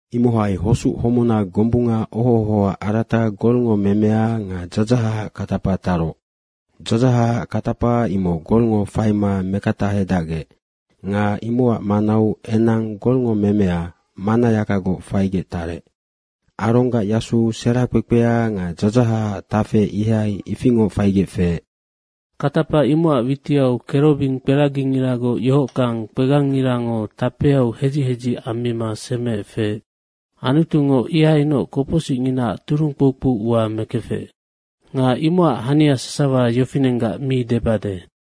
Imohai hosuc homuna gombunga oho ohoac arata golngo memea nga dzadzahacac katapa taroc. Dzadzahacac katapa imoc golngo faima mekatahedacgec nga imocac manau enang golngo memea mannayakagoc faigec tarec. Aronggac yasu sera kpekpea nga dzadzahacac tafe ihai ifingoc faigec feec. Katapa imocac witiau kerobing kibikperagingiragoc yohockang kpegangngirango tapeau hedzic hedzic ammima semeec feec. Antungo ihainoc kopocsicnginaac turung kpoukpou ua mekefec. Nga imocac hania sasawa yofinenggac mi debade.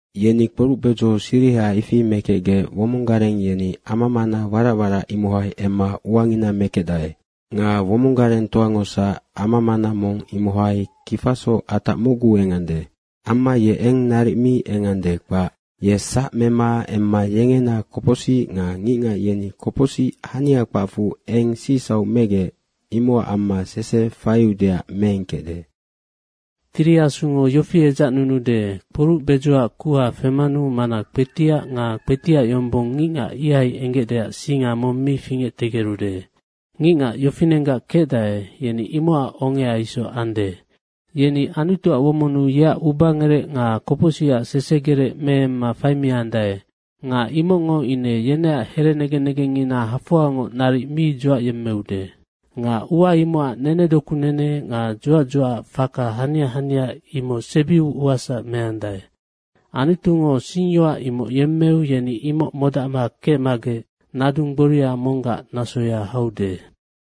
Yeni kporuc bedzo siriha ifi mekecgec womong gareng yeni ama mana warac warac imohai emma uangina mekecdae. Nga womong garengtoangosac ama mana mong imohai kifasoc atac mocgu engande. Amma ye eng naric mi engande, kpac. Ye sac mema emma yengena kopocsic nga ngicngac yeni kopocsic hania kpacfu eng sicsauc megec, imocac amma sese faiudeac meengkecde. Nga Tiri Asungo yofi edzacnunude, Kporuc bedzoac kuha femanu mana kpetiac nga kpetiac yombong ngicngac ihai enggecdeac singa mong mi fingectegerude. Ngicngac yofinenggac kecdae, yeni imocac ongea isoc ande. Yeni Anutuac womonnu yeac ubangerec nga kopocsicac sesegerec meemma faimiandae nga imocngo ine yeneac herenegen negengngina hafoangoc naric mi dzuacyemmeude. Nga ua imocac nenedoku nene nga dzuac dzuacac faka hania hania imoc sebiu uasac meandae. Anutungo singyoac imoc yemmeu, yeni imoc modacma kecmagec nadung gboria monggac nasoya haude.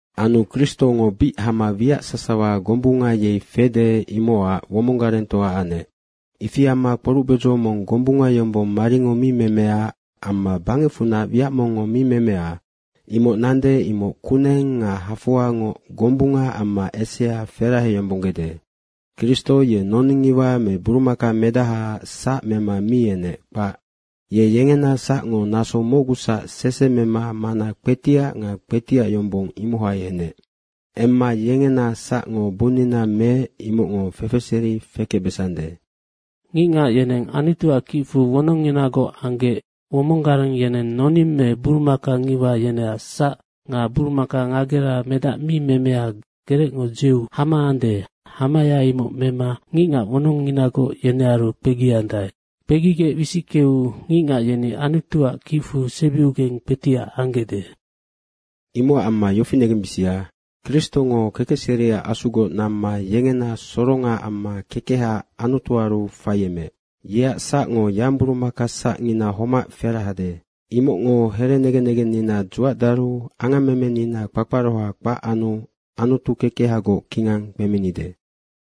Anu Kristongo bic hama wiac sasawa gombunga yei fede, imocac womong garengtoa anec. Ifi amma kporuc bedzo mong gombunga yombong maringo mi memea amma bangecfunac wiac mongngo mi memea, imoc nande, imoc kuneng nga hafoangoc gombunga amma esea feraheyombonggede. Kristo ye noning ngiwa me burumaka medahaac sac mema mi enec, kpac. Ye yengena sacngo naso mocgusac sese mema mana kpetiac nga kpetiac yombong, imohai enec. Emma yengena sacngo bunnina meec, imocngo fefeseri fekecbesande. Ngicngac yeneng Anutuac kicfu wonongnginagoc anggec womong gareng yeneng noning me burumaka ngiwa yeneac sac nga burumaka ngagera medac mi memea gerecngo dzeu hama ande, hamaya imoc mema ngicngac wonongnginagoc yenearu kpegiandae. Kpegigec wisickeu ngicngac yeni Anutuac kicfu sebiugeng kpetiac anggecde. Imocac amma yofi negembisia, Kristongo kekecseriac Asugoc namma yengena soronga amma kekeha Anutuaru faiemeec. Yeac sacngo yangburumaka sacngina homac ferahede. Imocngo herenegen negennina dzuacdaru angammemenina kpakparoha kpac anu Anutu kekehagoc kingang kpeminide.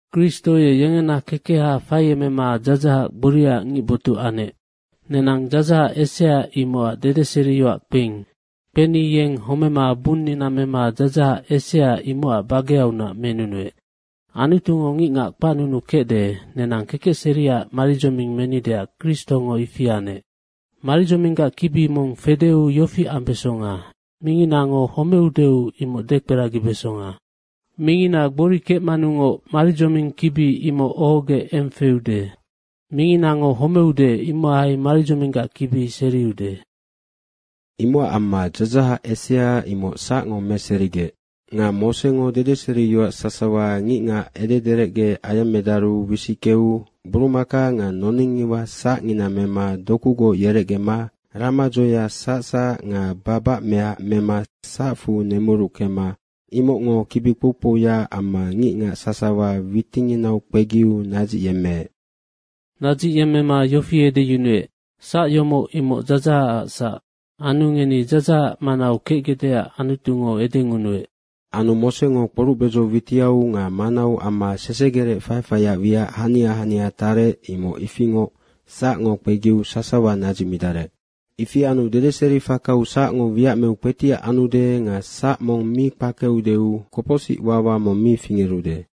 Kristo ye yengena kekeha faiemema dzadzahac gboriaac ngicbotuc anec. Nenang dzadzahac esea imocac dedeseriyoac kpeing. Kpeni yeng homema bunnina mema dzadzahac esea imocac bageaunac menunuec. Anutungo ngicngac kpacnunukecde, nenang kekecseriac maridzoming menideac Kristongo ifi anec. Maridzominggac kibi mong fedeu yofi ambesonga, minginango homeudeu, imoc dekperagibesonga. Mingina gbori kecmanungoc maridzoming kibi imoc ohogec eng feude. Minginango homeude, imohai maridzominggac kibi seriude. Imocac amma dzadzahac esea imoc sacngo meserigec. Nga Mosengo dedeseriyoac sasawa ngicngac edederecge ayemmedaru wisickeu burumaka nga noning ngiwa sacngina mema dokugoc yerecgema ramadzoea sacsac nga babacmeac mema sacfu nemuruckema imocngo kibi kpou kpouya amma ngicngac sasawa witinginau kpegiu nadzicyemmeec. Nadzicyemmema yofi edeyunuec, “Sac yomoc, imoc dzadzahacac sac. Anu ngeni dzadzahac manau kecgecdeac Anutungo edengunuec.” Anu Mosengo kporuc bedzo witiau nga manau amma sesegerec faifaiac wiac hania hania tarec, imoc ifingoc sacngo kpegiu sasawa nadzicmidarec. Ifi anu dedeseri fakau sacngo wiac meu kpetiac anude nga sac mong mi kpakeudeu kopocsic wawa mong mi fingerude.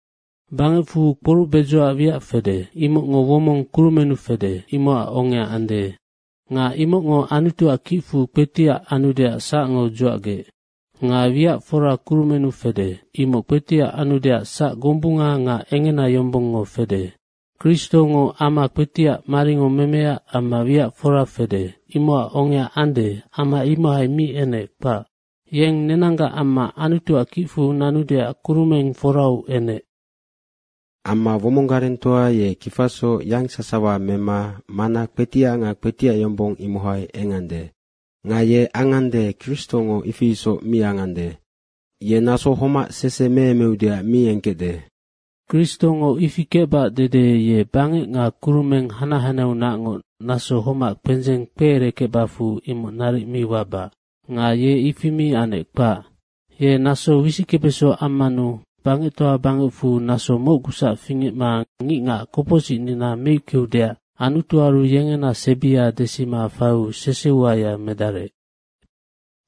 Bangecfu kporuc bedzoac wiac fede, imocngo womong kurumennu fede, imocac ongea ande. Nga imocngo Anutuac kicfu kpetiac anudeac sacngo dzuacgec. Nga wiac fora kurumennu fede, imoc kpetiac anudeac sac gombunga nga engena yombongngo fede. Kristongo ama kpetiac maringo memea amma wiac fora fede imocac ongea ande, ama imohai mi enec, kpac. Yeng nenanggac amma Anutuac kicfu nanudeac kurumeng forau enec. Amma womong garengtoa ye kifasoc yangsawa mema mana kpetiac nga kpetiac yombong, imohai engande. Nga ye angande, Kristongo ifi isoc mi angande. Ye naso homac sese meemeudeac mi engkecde. Kristongo ifi kecbac dede ye bangec nga kurumeng hanac hanaheaunacngoc naso homac kpendzeng kpeerekecbacfu imoc naric mi wabac. Nga ye ifi mi anec, kpac. Ye naso wisickebeso ammanu bangectoa bangecfu naso mocgusac fingecma ngicngac kopocsicnina meickeudeac Anutuaru yengena sebia desima faiu sese uaya medarec.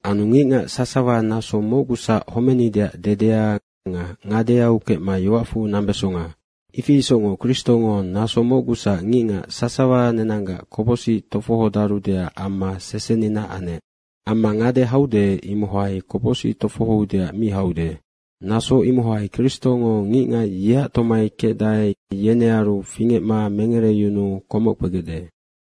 Anu ngicngac sasawa naso mocgusac homenideac dedea nga ngadeau kecma yoacfu nambesonga. Ifi isocngoc Kristongo naso mocgusac ngicngac sasawa nenanggac kopocsic tofohodarudeac amma sesenina anec. Amma ngade haude, imohai kopocsic tofohoudeac mi haude. Naso imohai Kristongo ngicngac yeac tomai kecdae, yenearu fingecma mengereyunuu komoc kpegecde.